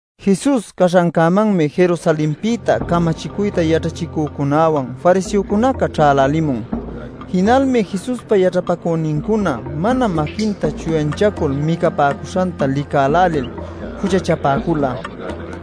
Jesus caśhancämanmi Jerusalenpïta camachicuyta yaćhachicücunäwan fariseocunaca ćhälälimun. Jinalmi Jesuspa yaćhapacünincuna mana maquinta chuyanchacul micapäcuśhanta licalcälil juchachapäcula.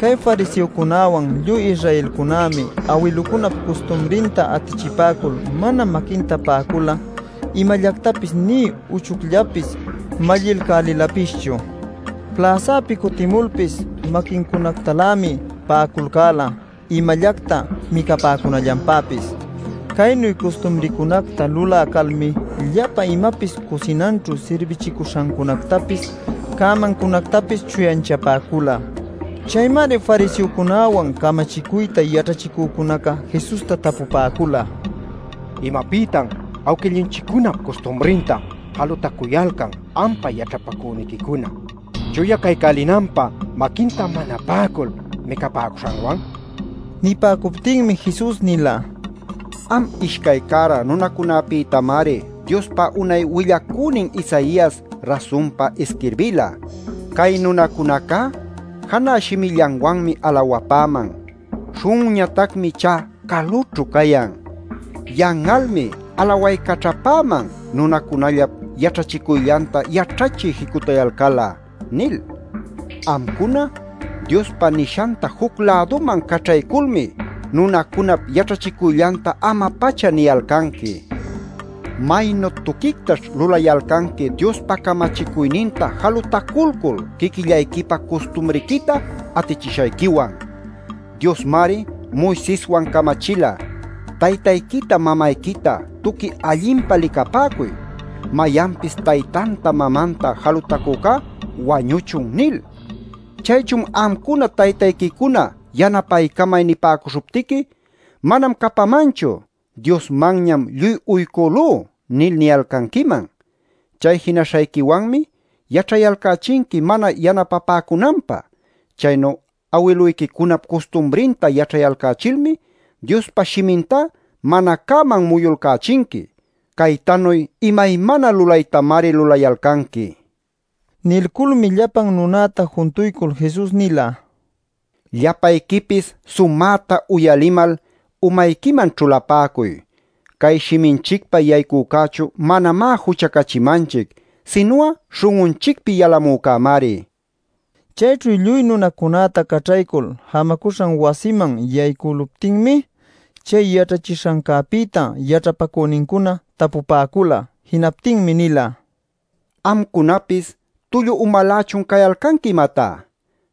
(Cay fariseocunawan lluy Israelcunämi awiluncunap custumrinta atichipäcul mana maquinta pa'acul'a imallactapis nï uchucllapis mallilcälïlapischu. Pläsäpi cutimulpis maquincunactalämi pa'aculcäla imallacta micapäcunallanpäpis. Caynu custumrincunacta lulä calmi, llapa imapis cusinanćhu sirbichicuśhancunactapis, cämancunactapis chuyanchapäcula.) Chaymari fariseocunäwan camachicuyta yaćhachicücunaca Jesusta tapupäcula: “¿Imapïtatan awquillunchiccunap custumrinta jalutacuyalcan ampa yaćhapacüniquicuna chuya caycälinanpä maquinta mana pa'acul micapäcuśhanwan?” nil. Nipäcuptinmi Jesus nila: “Am ishcay cära nunacunapïtamari Diospa unay willacünin Isaias rasunpa isquirbila: ‘Cay nunacunacá janä shimillanwanmi alawapäman. Śhun'unñatacmi ichá calućhu cayan. Yan'almi alawaycaćhapäman, nunacunallap yaćhachicuyllanta yaćhachiy jicutayalcal'a’ nil. “Amcuna Diospa nishanta juc-läduman caćhayculmi nunacunap yaćhachicuyllanta ama-pacha niyalcanqui. ¡Maynu tuquictaćh lulayalcanqui Diospa camachicuyninta jalutaculcul quiquillayquipa custumriquita atichishayquiwan! Diosmari Moiseswan camachila: ‘Taytayquita, mamayquita tuqui allinpa licapäcuy; mayanpis taytanta, mamanta jalutacücá wañuchun’ nil. Chaychun amcuna taytayquicuna ‘yanapaycamay’ nipäcuśhuptiqui ‘Manam capamanchu; Diosmanñam lluy uycülú’ nil niyalcanquiman. Chay jinaśhayquiwanmi yaćhayalcächinqui mana yanapapäcunanpä. Chaynu awiluyquicunap custumrinta yaćhayalcächilmi Diospa Shimintá mana cäman muyulcächinqui. Caytanuy imaymana lulaytamari lulayalcanqui” nil. Nilculmi llapan nunäta juntuycul Jesus nila: “Llapayquipis sumäta uyalimal, umayquiman ćhulapäcuy. Cay shiminchicpa yaycücächu manamá juchacachimanchic sinu'a śhun'unchicpi yalamücämari” nil. Chayćhu lluy nunacunäta caćhaycul jamacuśhan wasiman yaycüluptinmi, chay yaćhachishancäpïta yaćhapacünincuna tapupäcula. Jinaptinmi nila: “¿Amcunapis tullu umalächun cayalcanqui, imatá?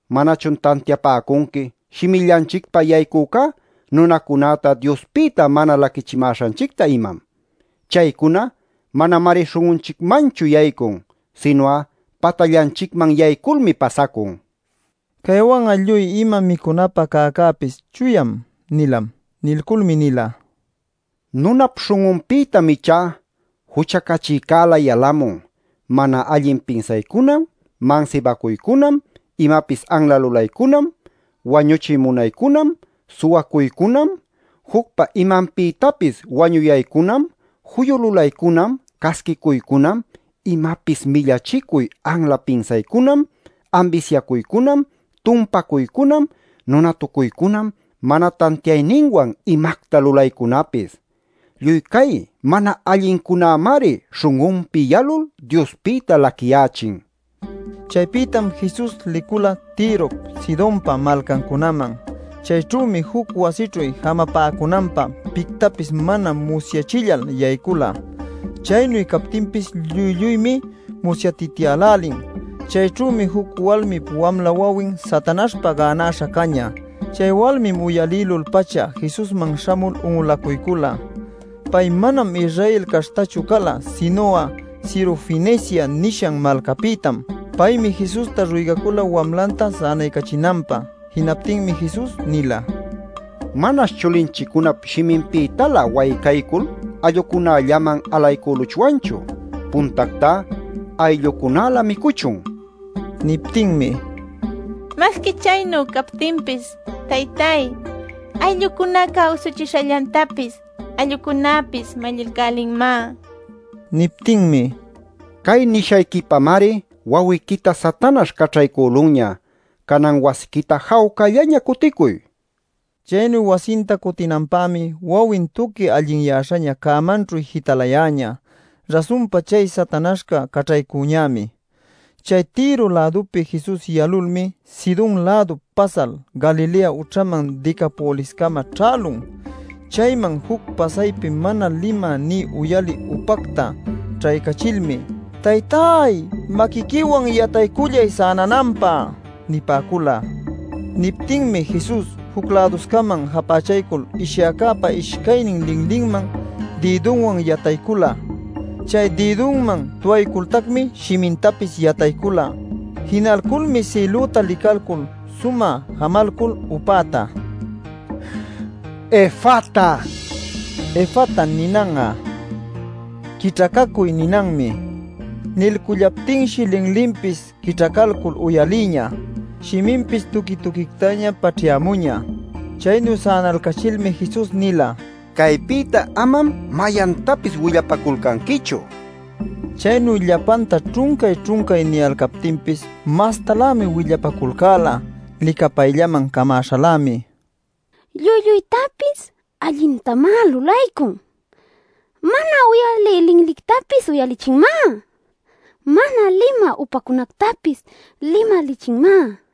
¿Manachun tantiapäcunqui shimillanchicpa yaycücá nunacunäta Diospïta mana laquichimäśhanchicta, imam? Chaycuna manamari śhun'unchicmanchu yaycun, sinu'a patallanchicman yayculmi pasacun” nila. (Caywan'a lluy ima micunapä cäcäpis “chuyam” nilam.) Nilculmi nila: “Nunap śhun'unpïtam ichá juchacachïcälä yalamun: mana allin pinsaycunam, mansibacuycunam, imapis anla lulaycunam, wañuchiy munaycunam, suwacuycunam, jucpa imanpïtapis wañuyaycunam, juyu lulaycunam, casquicuycunam, imapis millachicuy anla pinsaycunam, ambisyacuycunam, tumpacuycunam, nunatucuycunam, mana tantiayninwan imacta lulaycunapis. Lluy cay mana allincunämari śhun'unpi yalul Diospïta laquiyächin” nil. Chaypïtam Jesus licula Tirop, Sidonpa malcancunaman. Chayćhümi juc wasićhu jamapacunanpä pictapis mana musyachillal yaycula. Chaynu captinpis lluy lluymi musyatityälälin. Chayćhümi juc walmip wamla wawin Satanaśhpa gänäśha cañä. Chay walmim uyalïlul-pacha Jesusman śhamul un'ulacuycula. Pay manam Israel caśhtachu cala, sinu'a Sirofenicia nishan malcäpïtam. Paymi Jesusta ruygacula wamlanta sänaycachinanpä. Jinaptinmi Jesus nila: “Manash chulinchiccunap shiminpïtalä waycaycul allucunallaman alaycüluchwanchu. Puntactá ayllucunalä micuchun” nil. Niptinmi: “Masqui chaynu captinpis, taytáy, ayllucunaca usuchishallantapis allucunäpis mallilcälinmá” nila. Niptinmi: “Cay nishayquipamari wawiquita Satanaśh caćhaycülunña. Canan wasiquita jawcallaña cuticuy” nin. Chaynu wasinta cutinanpämi wawin tuqui allinyäśhaña cämanćhu jitalayäñä. Rasunpa chay Satanaśhca caćhaycuñämi. Chay Tiro-lädupi Jesus yalulmi Sidon-lädup pasal Galilea ućhaman Decapoliscama ćhälun. Chayman juc pasaypi mana limä, nï uyalï upacta ćhaycachilmi: “Taytáy, maquiquiwan yataycullay sänananpä” nipäcula. Niptinmi Jesus juc-läduscaman japächalcul, ishyäcäpa ishcaynin linlinman dïdunwan yataycula. Chay dïdunman tuwaycultacmi shimintapis yataycula. Jinalculmi sïlüta licalcul sumä jamalcul upäta: “Efata” nila. (“Efata” ninan'a “quićhacacuy” ninanmi.) Nilcullaptinshi linlinpis quićhacalcul uyalïñä, shiminpis tuqui tuquictaña paćhyämuñä. Chaynu sänalcachilmi Jesus nila: “Caypïta amam mayantapis willapaculcanquichu” nil. Chaynu llapanta ćhuncay-ćhuncay niyalcaptinpis mastalämi willapaculcäla. Licapayllaman camäśhalämi: “¡Lluy lluytapis allintamá lulaycun! ¡Mana uyalï linlictapis uyalichinmá! ¡Mana limä upacunactapis limalichinmá!” nila.